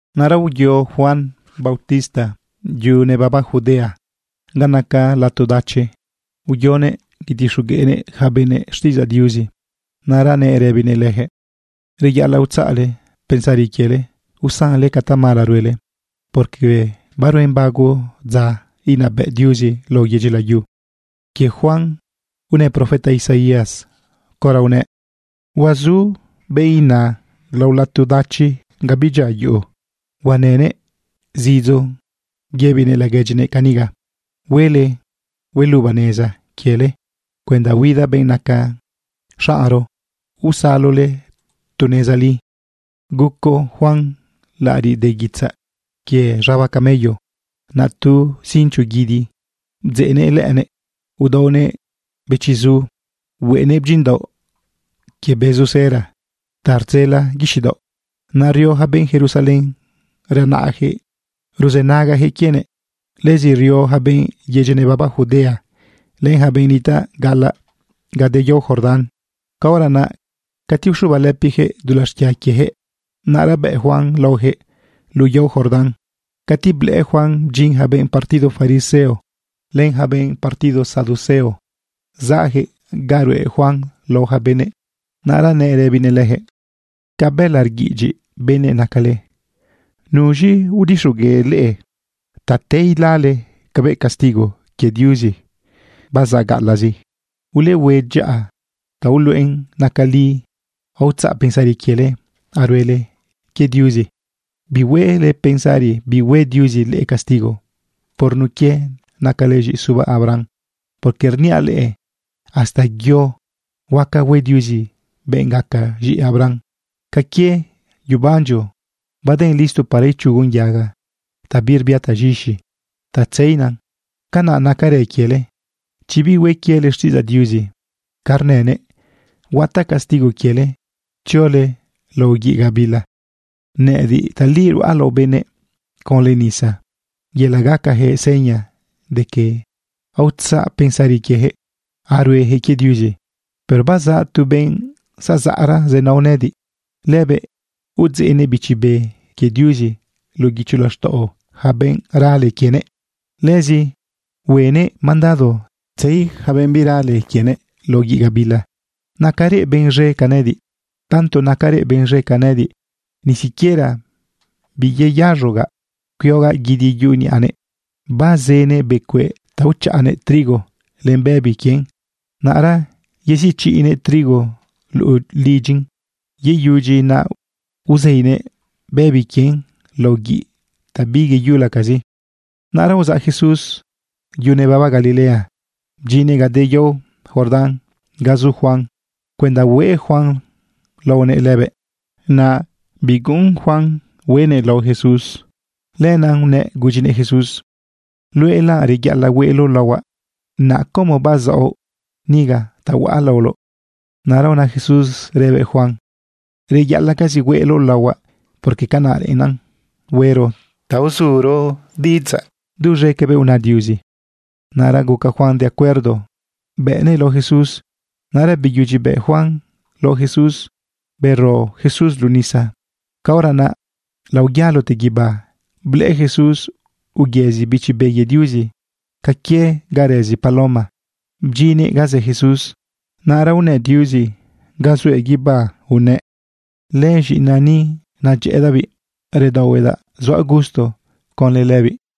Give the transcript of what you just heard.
Naꞌra uyo Juan bautista yu nebaba Judea ga naca lato dachi. Uyonëꞌ yetixogueꞌnëꞌ ja benëꞌ xtiꞌidzaꞌ Diuzi. Naꞌra nëꞌ rëbinëꞌ lëjëꞌ: ―Reyaꞌalaꞌ utzaꞌle pensari quiele usanle ca tamala ruele, porque baruen bago dza inabëꞌ Diuzi lao yedyi layu. Quie Juan unë profeta Isaías caora unëꞌ: Huazu benꞌ naꞌ lao lato dachi ga bidyia yuꞌu. Huanëꞌ zidzo rëbinëꞌ laguedyinëꞌ caniga: “Huele hueluba neza quiele cuenda huida benꞌ naca xaꞌnro, usalole tu neza li.” Guco Juan laꞌariꞌ de guitzaꞌ quie z̃aba camello. Naꞌ tu cincho guidi bdzeꞌnëꞌ lëꞌënëꞌ. Udaonëꞌ bëchiꞌzu, hueꞌenëꞌ bdyinꞌdaoꞌ quie bezu cera ta rdzela guixiꞌ daoꞌ. Naꞌ rio ja benꞌ Jerusalén renaꞌjëꞌ ruzënagajëꞌ quienëꞌ. Lëzi rio ja benꞌ yedyi nebaba Judea len ja benꞌ nitaꞌ gaꞌalaꞌ ga de yao Jordán. Caora naꞌ cati uxubalëpijëꞌ dulaꞌ xquia quiejëꞌ, naꞌra bëꞌ Juan laojëꞌ luꞌu yao Jordán. Cati blëꞌë Juan bdyin ja benꞌ partido fariseo len ja benꞌ partido saduceo zaꞌjëꞌ ganꞌ ruꞌe Juan lao ja benëꞌ, naꞌra nëꞌ rëbinëꞌ lëjëꞌ: ―¡Ca bëla rguiꞌidyiꞌ benëꞌ nacale! ¿Nuz̃i udixogueꞌ leꞌe ta te ilale cabëꞌ castigo quie Diuzi bazaꞌ gaꞌalaꞌzi? Ulehue dyaꞌa ta uluꞌen nacan li aotzaꞌ pensari quiele, aruele quie Diuzi. Bihuele pensari bihue Diuzi leꞌe castigo por nun quie nacale z̃iꞌi suba Abraham. Porque rniaꞌ leꞌe hasta yo huaca hue Diuzi benꞌ gaca z̃iꞌi Abraham. Ca quie yebandyo baden listo para ichugon yaga ta birbia taz̃ixi ta tzeina, canaꞌ nacarën quiele. Chi bihue quiele xtiꞌidzaꞌ Diuzi ca rnënëꞌ, huataꞌ castigo quiele tziole lao guiꞌ gabila. Nëꞌëdiꞌ tali ruꞌa lao benëꞌ conlë nisa yelaꞌ gacajëꞌ seña de que aotzaꞌ pensari quiejëꞌ aruejëꞌ quie Diuzi. Pero bazaꞌ tu benꞌ zazaꞌra zenao nëꞌëdiꞌ. Lëbëꞌ udzeꞌnëꞌ Bichi Be quie Diuzi luꞌu guicho laxtaꞌo ja benꞌ rale quienëꞌ. Lëzi huenëꞌ mandado tzei yaca benꞌ birale quienëꞌ lao guiꞌ gabila. Nacarëꞌ benꞌ z̃e ca nëꞌëdiꞌ. Tanto nacarëꞌ benꞌ z̃e ca nëꞌëdiꞌ, ni siquiera biyeyaz̃ogaꞌ cuiogaꞌ guidi yuꞌu niꞌanëꞌ. Bazënëꞌ becueꞌ ta uchaꞌanëꞌ trigo len bëbi quien. Naꞌra yeziꞌchiꞌnëꞌ trigo luꞌu lidyin. Yeyudyin naꞌ uzeinëꞌ bëbi quien lao guiꞌ ta biyeyulacazi. Naꞌra uzaꞌ Jesús yu nebaba Galilea bdyinnëꞌ ga de yao Jordán ga zu Juan cuenda hueꞌ Juan laonëꞌ lëbëꞌ. Naꞌ biguꞌun Juan hueꞌnëꞌ lao Jesús. Lenaꞌ unëꞌ gudyinëꞌ Jesús: ―Luëꞌla reyaꞌalaꞌ hueꞌloꞌ laohuaꞌ. ¿Naꞌ como bazaoꞌ niga ta huaꞌ laoloꞌ? Naꞌra una Jesús rëbëꞌ Juan: ―Reyaꞌalaꞌcazi hueꞌloꞌ laohuaꞌ, porque canaꞌ reꞌennan huero ta uzuro duz̃e cabëꞌ una Diuzi. Naꞌra guca Juan de acuerdo, bëꞌnëꞌ lao Jesús. Naꞌra beyudyi bëꞌ Juan lao Jesús, bero Jesús luꞌu nisa. Caora naꞌ laoyalote guibá blëꞌë Jesús uyëzi Bichi Be quie Diuzi ca quie ga rëzi paloma. Bdyinnëꞌ ga zë Jesús. Naꞌra unë Diuzi ga zuëꞌ guibá unëꞌ: ―Lëz̃iꞌinaꞌ ni, nedyëꞌëdaꞌbiꞌ. Redaohuedaꞌ zuaꞌ gusto conlë lëbiꞌ.